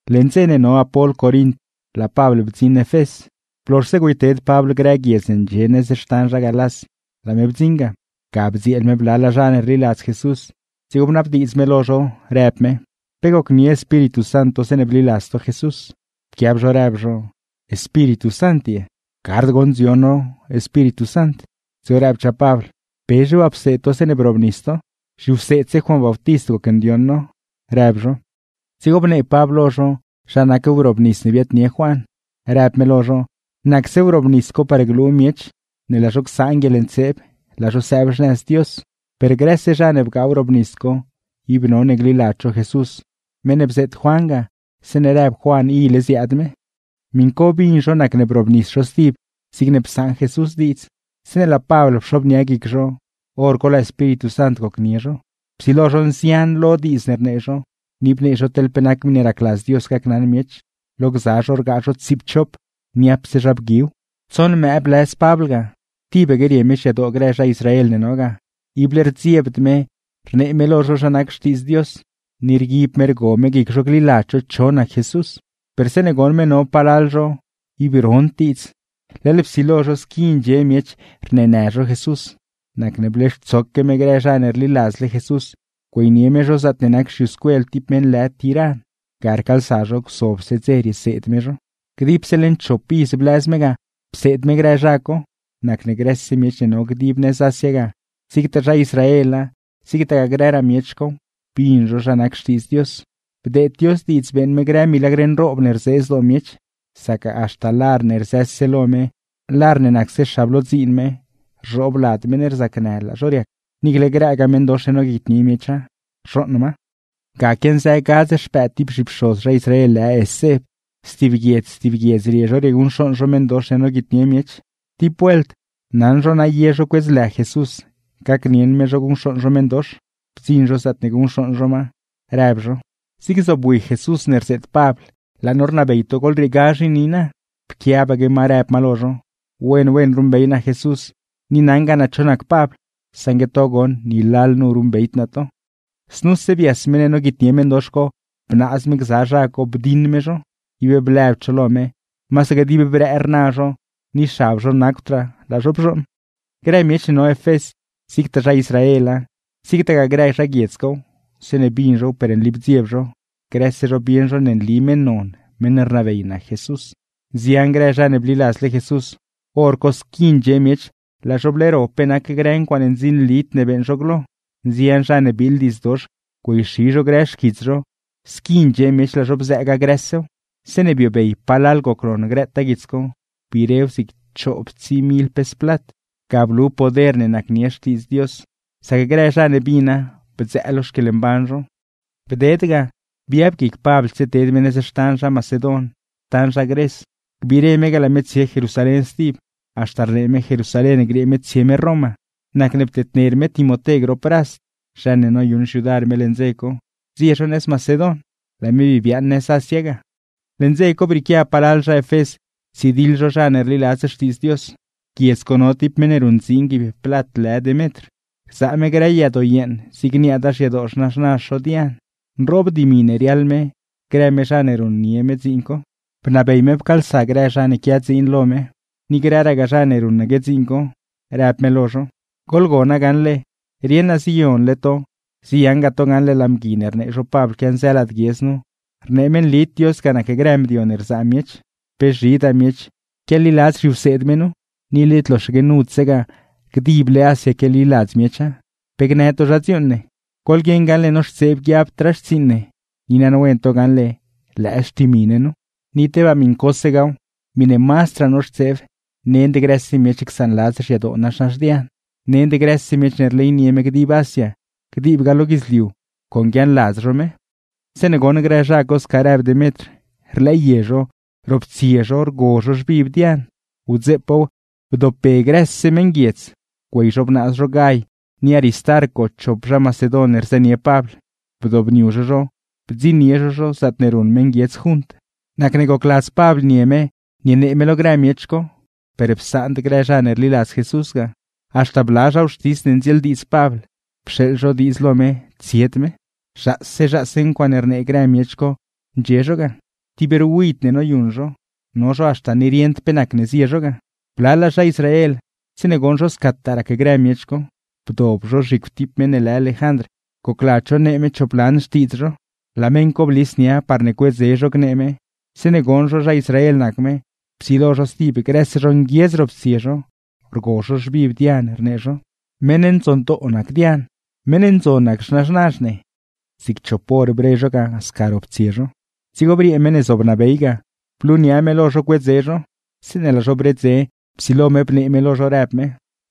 Leṉ dze ne no Apol Corint, laa Pabl bdziṉ Efés. Blozhse güeyted Pabl grë guiedz ne ndxie nëz xtan zha Galás, laa me bdziṉ ga. Ga bdzieel me blalaa zha ne rliladz Jesús, dzigo bnabdiidz me lo zho, rëb me: ―¿Pe bgaa to guieḻbiini ne rneedz Espíritu Sant, zeeṉe bliladz to Jesús? Pquiab zho rëb zho: ―¿Guieḻbiini ye? Gard goṉ dzion no rdeed Espíritu Sant guieḻbiini. Dzigo rëbchaa Pabl: ―¿Pezhe waa pseed to zeeṉe brobnis to? ―Zhiwseedse Juan Bautist gocndioṉ no ―rëb zho. Dzigo bnee Pabl lo zho zha nac wrobnis ne biaadnie Juan. Rëb me lo zho nacse wrobnis co par glu miech ne laa zho csaan guieḻntseeb, laa zho sëëb xnëz Dios; per grëse zha ne bgaa wrobnis co ib none gliladz zho Jesús, meṉ ne bzeet Juan ga zeeṉe rëb Juan ile ziaad me. Miṉ co bin zho nacne brobnis zho stib zigne psaṉ Jesús diidz. Zeeṉe laa Pabl pxobnia guic zho bnab me gdeed Espíritu Sant guieḻbiini lo zho, hor co psilo zho nzian lo diidz ne rnee zho; ni bnee zho teḻ pe nac miṉe racladz Dios gacnaṉ miech. Lo gza zho rgaa zho tsiipchop, niapse zha bguiw. Tsoṉ mëë blëz Pabl ga, tibaque rie me xyadoo grë zha Israel ne no ga, ible rdziebd me rnee me lo zho zha nac Xtiidz Dios, ni rguib me rgo me guic zho gliladz zho cho nac Jesús. Per zeeṉe goṉ me no palal zho ib rond diidz, leḻ psilo zho squi ndxie miech rneenë zho Jesús, nacne bleextsoque me grë zha ne rliladzle Jesús, güeynie me zho zaatne nac xyuscuel ti meṉ lë Tiran; ga rcaalsa zho gzobse dze rieseed me zho. Dipse leṉ chop iz blëz me ga pseed me grë zha co; nacne grëse miech ne no dib nëz Asia ga, zigtaa zha Israela zigtagaa grëraa miech cow, bin zho zha nac Xtiidz Dios. Bdeed Dios diidz beeṉ me grë milagr nroob ne rzee zdoo miech; sac haxta lar ne rzëse nia me, lar ne rbixse me rzhoob lad meṉ ne rzacnë laa zho riac, niicle grëgaa meṉdox ne noguitnie miecha, rzhooṉ ma. Ga quianzë gadz xpëëd ti zhipxoz zha Israel lë Escev, stib guiedz stib guiedz rie zho rieguṉcxooṉ zho meṉdox ne noguitnie miech. Ti vuelt, naṉ zho na ye zho cuedz lë Jesús gacnieṉ me zho guṉcxooṉ zho meṉdox; bdziṉ zho zaatne guṉcxooṉ zho ma, rëb zho: ―¡Zig zobwi Jesús ne rzeet Pabl, laa no rnabey to goḻrieegazh i niina! Pquiabaque ma rëb ma lo zho: ―Wen wen ruṉbey naa Jesús ni naṉgaa naa cho nac Pabl, saṉgue to goṉ ni lalnu ruṉbeyd naa to. Znuse bias meṉ ne noguitnie meṉdox co, bnaaz me gza zha co bdiṉ me zho. Ib blëbd zho lo me, masaque dib brëë rna zho, ni xab zho nacwdraa, laa zho bzhooṉ. Grë miech ne no Efés, zigtaa zha Israela, zigtagaa grë zha guiedz cow, zeeṉe bin zhow per nli bdzieb zho; grëse zho bieṉ zho ne nli meṉ non, meṉ rnabey nac Jesús. Haxta ye grë zha ne rliladzle Jesús, hor co laa zho bleero pe nac grë ncuaaṉe ndzinlid ne bliladz zho glo. Nzian zha ne biiḻ diidz dox güeyxi zho grë xquits zho, squi ndxie miech laa zho bzëëga grësew. Zeeṉe biobey palal gocnon grëtaa guits co, biirew zig chooptsii mil pes plat. Ga blu poder ne nacnie Xtiidz Dios, sac grë zha ne bina bdzëë lo xquieḻmban zho. Bded ga, biab guic Pabl tsieted me nëz xtan zha Macedon, xtan zha Gres, gbiire me ga laa me tsie Jerusalén stib; haxta rnee me Jerusalén griee me tsie me Roma. Nacne ptedner me Timoté grop Rast (zha ne noyuṉ xyudar me leṉ dze co) zie zho nëz Macedon, laa me bii biaaṉ nëz Asia ga. Leṉ dze co brieequia palal zha Efés ptsidiḻ zho zha ne rliladz Xtiidz Dios. Guiedz co no ti meṉ ne ruṉdziin guiib plat lë Demetr, rzaa me grë yadoo yeeṉ zig niaada xyadoo xnaxnazh zho Dian; nroob dimi ne riaḻ me grë me zha ne ruṉnie me dziin co; bnabey me pcaalsa grë zha ne quia dziin lo me, ni grëragaa zha ne ruṉaque dziin co, rëb me lo zho: ―Rieṉ naa ziyonle to, ziyaṉgaa to gaṉle laa mgui ne rnee zho Pabl quianzë lad guiedz nu, rnee me nlid Dios ga nac grë mdio ne rzaa miech. Pe zhidaale miech quialiladz zhiwseed me nu; ni led loxaque nudsegaa, dible Asia quialiladz miecha. ¿Pe gnë to zha dziuuṉ ne? Goḻguieṉ gaṉle noxtseeb guiabdraa xtsiiṉ ne, ni naṉwen to gaṉle lëë xtimi ne nu. Ni tebaa miṉcosegaaw, miṉe mazdraa noxtseeb nend grëse miech csaanladz xyadoo nazhnazh Dian, nend grëse miech ne rleynie me dib Asia, diibgaa lo guidzliuw con guiaaṉladz zho me. Zeeṉe goṉ grë zha co sca rëb Demetr, rlëë zho, roptsie zho rgo zho xviv Dian. Wdzeepaaw grëse meṉguiedz laa zho pcaalsa, güey zho bnaaz zho Gay ni Aristarco chop zha Macedon ne rzënie Pabl, bdobniu zho zho bdziṉnie zho zho ro yulow. Nacne gocladz Pabl nie me nienee me lo grë miech co, per psaand grë zha ne rliladz Jesús ga. Haxta bla zha wxtis ne ndzieeldiidz Pabl, pxeeḻ zho diidz lo me tsied me. Zhaase zhaase rnee grë miech co ndxie zho ro yulow ga, no zho haxta ni rieṉd pe nacne zie zho ga. Blalaa zha Israel, zeeṉe goṉ zho scataa rac grë miech co, bdob zho zhicw ti meṉ lë Lejandr gocladz zho nee me chop lan xtiidz zho. Laa meṉ co blis nia me parne cuedze zho gnee me; zeeṉe goṉ zho zha Israel nac me, psilo zho stib grëse zho nguiedz roptsie zho, rgo zho xviv Dian rnee zho: ―¡Meṉ ndzondoo nac Dian! ¡Meṉ ndzon nac xnaxnazh ne! Zig chop hor bre zho ga sca roptsie zho. Dzigo briee meṉ ne zobnabey ga, blunia me lo zho cuedze zho; zeeṉe laa zho bredze, psilo me bnee me lo zho rëb me: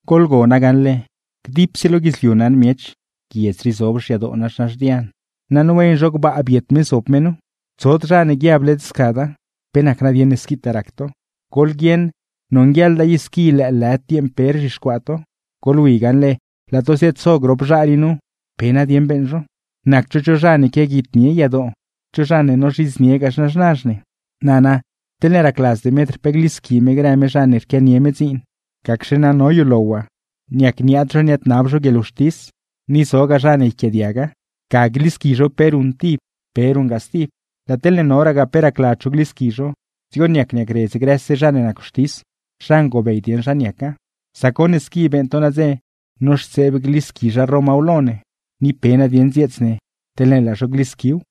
―Goḻgona gaṉle, grëse miech lo guidzliu naṉ zho guiedz rii zob nazhnazh Dian, naṉ wen zho gbaa biet me zob me nu; tsod zha ne guiab led scada. ¿Pe nac nadieṉ ne squitaa rac to? Goḻguieṉ gaṉle nonguieḻda i squi lëëlëd dieeṉ pe rzhixcuaa to. Goḻwi gaṉle, laa to ziaad-zo grop zha rii nu, ¿pe nadieṉ beeṉ zho? Nacd zho cho zha ne quiaguitnie yadoo, cho zha ne nozhidzniegaa xnaxnazh ne. Nana, teḻne racladz Demetr pe glisqui me grë me zha ne rquianie me dziin, gacxe na no yulow waa. Niac niaad zho niaadnab zho guieḻwxtis, ni zogaa zha ne yquiaadiaga. ¡Ga glisqui zho pe ruṉ tib, pe ruṉgaa stib! Laa teḻne noragaa pe racladz zho glisqui zho, dzigo niac niacredz grëse zha ne nac wxtis, zha ngobey dieṉ zha niaca. Sac goṉ ne squi beeṉ to nadze, noxtseeb glisqui zha Romaw lo ne; ni pe nadieṉ dzieets ne teḻne laa zho glisquiw.